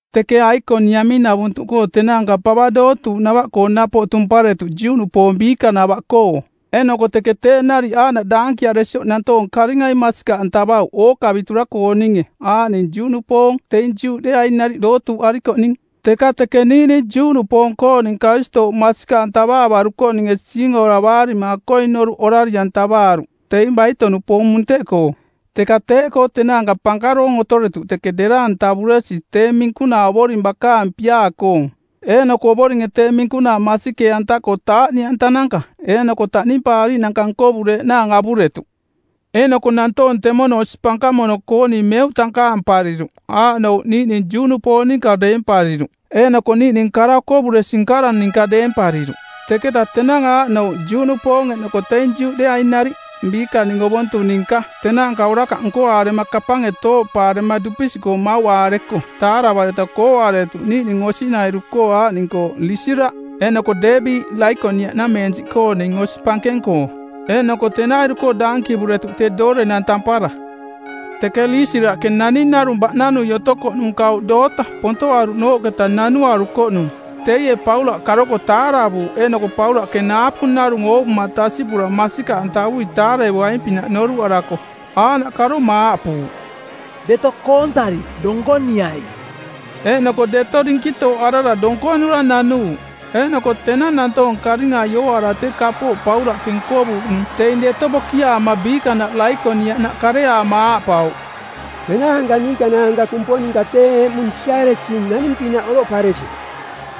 Teke Aikoniamiꞌnavuntuꞌkoo tenaanka pava dootuuꞌnava-koo napoꞌ tumparetuꞌ Juꞌnupoong biikanava-koo, eeꞌnoko teke teeꞌ nariꞌ aaꞌnaꞌ daankiaresioꞌ nantoong karingai masikaꞌantavauꞌ ookavitura-kooninge aaꞌning Juꞌnupoong teing Juꞌdeeaing nariꞌ dootuuꞌarikoꞌning. Teka teke niiꞌning Juꞌnupoong-kooning Karistooꞌ masikaꞌantavaavarukoꞌninge siingoravaarima akoing noruꞌ orari-antavaaruꞌ teing baito-nupoong munteꞌkoo. Teka teeꞌkoo tenaanka pankaroong otoretuꞌ teke dera-antavuresi tee minkunaa Ovoring bakaang piaa-koong, eeꞌnoko Ovoringe tee minkunaa masikee-anta-koo taaꞌniꞌantananka eeꞌnoko taꞌnimpaariiꞌnanka nkovureeꞌnaang avuretuꞌ. Eeꞌnoko nantoong temono osi pankamono-kooning meuꞌ tankaampariruꞌ, aaꞌnouꞌ niiꞌning Juꞌnupoong ninka deempariruꞌ eeꞌnoko niiꞌning kara-okovuresi-nkara ninka deempariruꞌ. Teketa tenang aaꞌnouꞌ Juꞌnupoong eeꞌnoko teing Juꞌdeeaing nariꞌ, biikaning ovontung ninka, tenaanka orakaꞌ nkoaarema kapange tooꞌpaarema dupisiꞌkoo mauꞌaareko taaravareta kooꞌaretuꞌ niiꞌning osinairu-koo aaꞌning-koo Liisiraꞌ eeꞌnoko Deebi, Laikoniaꞌnameensiꞌkooning osi pankeng-koo. Eeꞌnoko tenairu-koo daankivuretuꞌ tee doorenang tampara. Teke Liisiraꞌke naning narung baꞌnanui otokoꞌnung kauꞌ doota, pontoꞌaruꞌnooꞌketa nanuarukoꞌnung. Teie Paulaꞌ karoko taaravuuꞌ, eeꞌnoko Paulaꞌke naapu narung oovuma tasiꞌpura masikaꞌantavui taarevoaing-pinaꞌ noruꞌarako aaꞌnaꞌ karoma aaꞌpuuꞌ, “Deto koontari donkoniai.” Eeꞌnoko deto dinkitooꞌarara donkonura nanuuꞌ. Eeꞌnoko tenang nantoong karingai ooaara tee kapooꞌ Paulaꞌke nkovuuꞌnung teing deto bokiaama biikanaꞌ Laikoniaꞌnaꞌ kareaama aaꞌpauꞌ, “Tenaanka niikanaanka kumponinka tee eꞌmung siaresing naning-pinaꞌ oroꞌparesi.”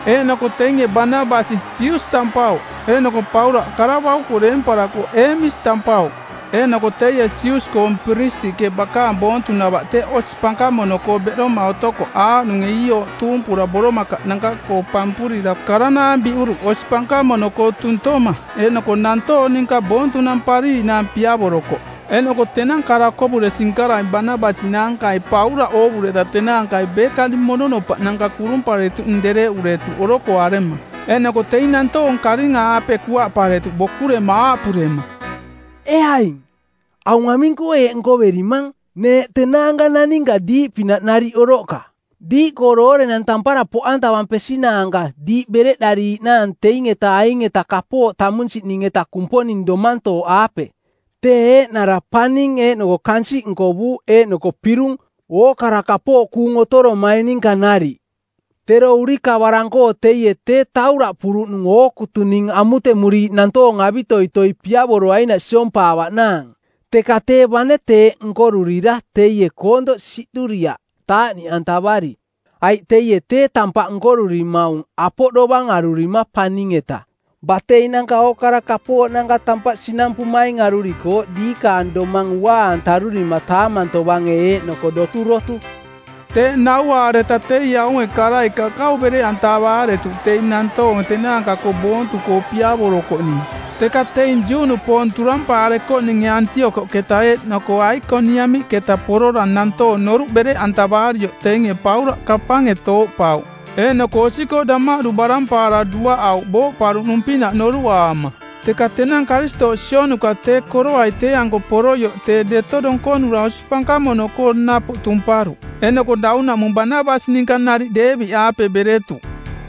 Eeꞌnoko teinge Banabasi Sius tampauꞌ, eeꞌnoko Paulaꞌ, kara bauko deemparako Eemis tampauꞌ. Eeꞌnoko teie Sius-koong piristiꞌke, bakaang boontunava teꞌ osi pankamono-koo beꞌdoma otokoꞌ aaꞌnunge iiooꞌ tuumpura boromakaꞌnanka-koo pampurira karanaang biꞌuruꞌ osi pankamono-koo tuntoma, eeꞌnoko nantoong ninka boontunampariiꞌnaang piavorokoꞌ. Eeꞌnoko tenang kara-okovuresi-nkarai Banabasi naankai Paulaꞌ oovureta tenaankai beekaning mononopaꞌnanka kurumparetuꞌning dereꞌuretuꞌ orokoarema. Eeꞌnoko teing nantoong karinga-aape kuaꞌparetuꞌ bokurema aaꞌpurema, “Ee aing, aung aming-koo eeꞌ nkoverimang? Neeꞌ tenaanka naninka diiꞌpinaꞌ nariꞌ oroꞌka, diiꞌkoo doorenang tampara poꞌantavampesinaanka diiꞌ bereꞌdariiꞌnaang teing-eta aing-eta kapooꞌ tamunsiꞌning-eta Kumponing domantooꞌaape, tee eeꞌnara paning eeꞌnoko kansiꞌ nkovuuꞌ eeꞌnoko pirung ookara kapooꞌ kuung otoromaing ninka nariꞌ. Tero urikavarang-koo teie tee tauraꞌpuruꞌnung ookutuning amutemuriiꞌ nantoong avitoitoi piavoroainaꞌ siompaavaꞌnaang. Teka tee bane teeꞌ nkorurira teie koontoꞌ siꞌduriaꞌ taaꞌniꞌantavari, aiꞌ teie tee tampaꞌ nkorurimaung apoꞌ dovang arurima paning-eta, bateinananka ookara kapooꞌnanka tampaꞌ sinampumaing arurikooꞌ diikaang domang unaa-antarurima taamang tovange eeꞌnoko doturotu.” Teeꞌ nauaareta teie aunge karai kakau bereꞌantavaaretuꞌ teing nantoong tenaanka-koo boontu-koo piavorokoꞌning. Teka teing Juꞌnupoong turampaarekoꞌninge Antiokoꞌketa eeꞌnoko Aikoniamiꞌketa porora nantoong noruꞌ bereꞌantavaarioꞌ teinge Paulaꞌ kapange tooꞌpauꞌ eeꞌnoko osi-koo damaꞌdu barampaara duaꞌauꞌ booꞌparuꞌnung-pinaꞌ noruꞌaama. Teka tenang Karistooꞌ sionuka tee koroai tee-anko poroioꞌ tee deto donkonura osi pankamono-koo napoꞌ tumparuꞌ, eeꞌnoko daunaꞌmung Banabasi ninka nariꞌ Deebi-aape beretuꞌ.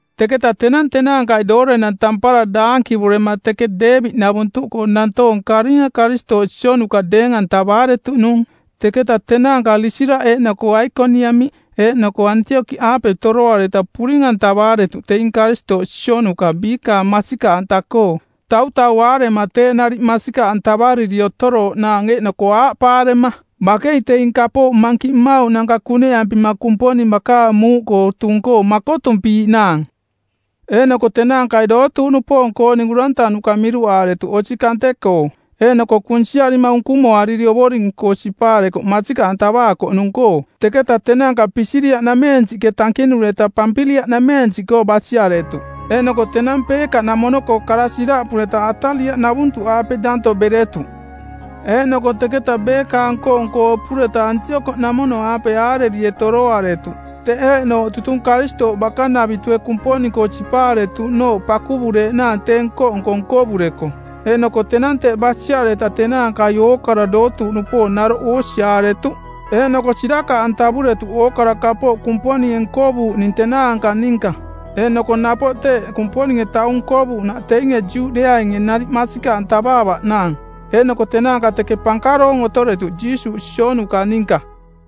Teketa tenang tenaankai doorenang tampara daankivurema teke Deebi-navuntuꞌkoo nantoong karinga Karistooꞌ sionuka deeng-antavaaretuꞌnung. Teketa tenaanka Liisiraꞌ eeꞌnoko Aikoniamiꞌ eeꞌnoko Antiokoꞌaape toroareta puring-antavaaretuꞌ teing Karistooꞌ sionuka biikaang masikaꞌanta-koo, tautauaarema teeꞌ nariꞌ masikaꞌantavariri otorooꞌnaang eeꞌnoko aaꞌpaarema, “Bakei teing kapooꞌ mankiꞌ mmauꞌnanka kuneꞌampima Kumponing bakaang muuꞌkoo tung-koo makotumpiiꞌnaang.” Eeꞌnoko tenaankai dootuuꞌnupoong-kooning urantanuka miruꞌaaretuꞌ osi kante-koo, eeꞌnoko kunsiarima unkumoariri Ovoring-koo sipaarekoꞌ masikaꞌantavaakoꞌnung-koo. Teketa tenaanka Pisidia-nameensiꞌke tankinureta Pampiliaꞌnameensiꞌkoo basiaretuꞌ. Eeꞌnoko tenang Peeka-namono-koo kara siraꞌpureta, Atalia-navuntuꞌaape danto beretuꞌ. Eeꞌnoko teketa beekaang nko-nko opureta Antiokoꞌnamono-aape aarerie toroaretuꞌ, teꞌ eeꞌnooꞌ tutung Karistooꞌ bakanavitue Kumponing-koo sipaaretuꞌnooꞌ pakuvureeꞌnaang tee nko-nko nkovureko. Eeꞌnoko tenang teꞌ basiareta tenaankai ookara dootuuꞌnupoong naroꞌ oosiaaretuꞌ eeꞌnoko sirakaꞌantavuretuꞌ ookara kapooꞌ Kumponinge nkovuuꞌning tenaanka ninka, eeꞌnoko napoꞌ teeꞌ Kumponinge taung nkovuuꞌnaꞌ teinge Juꞌdeeainge nariꞌ masikaꞌantavaavaꞌnaang. Eeꞌnoko tenaanka teke pankaroong otoretuꞌ Jiisuuꞌ sionuka ninka.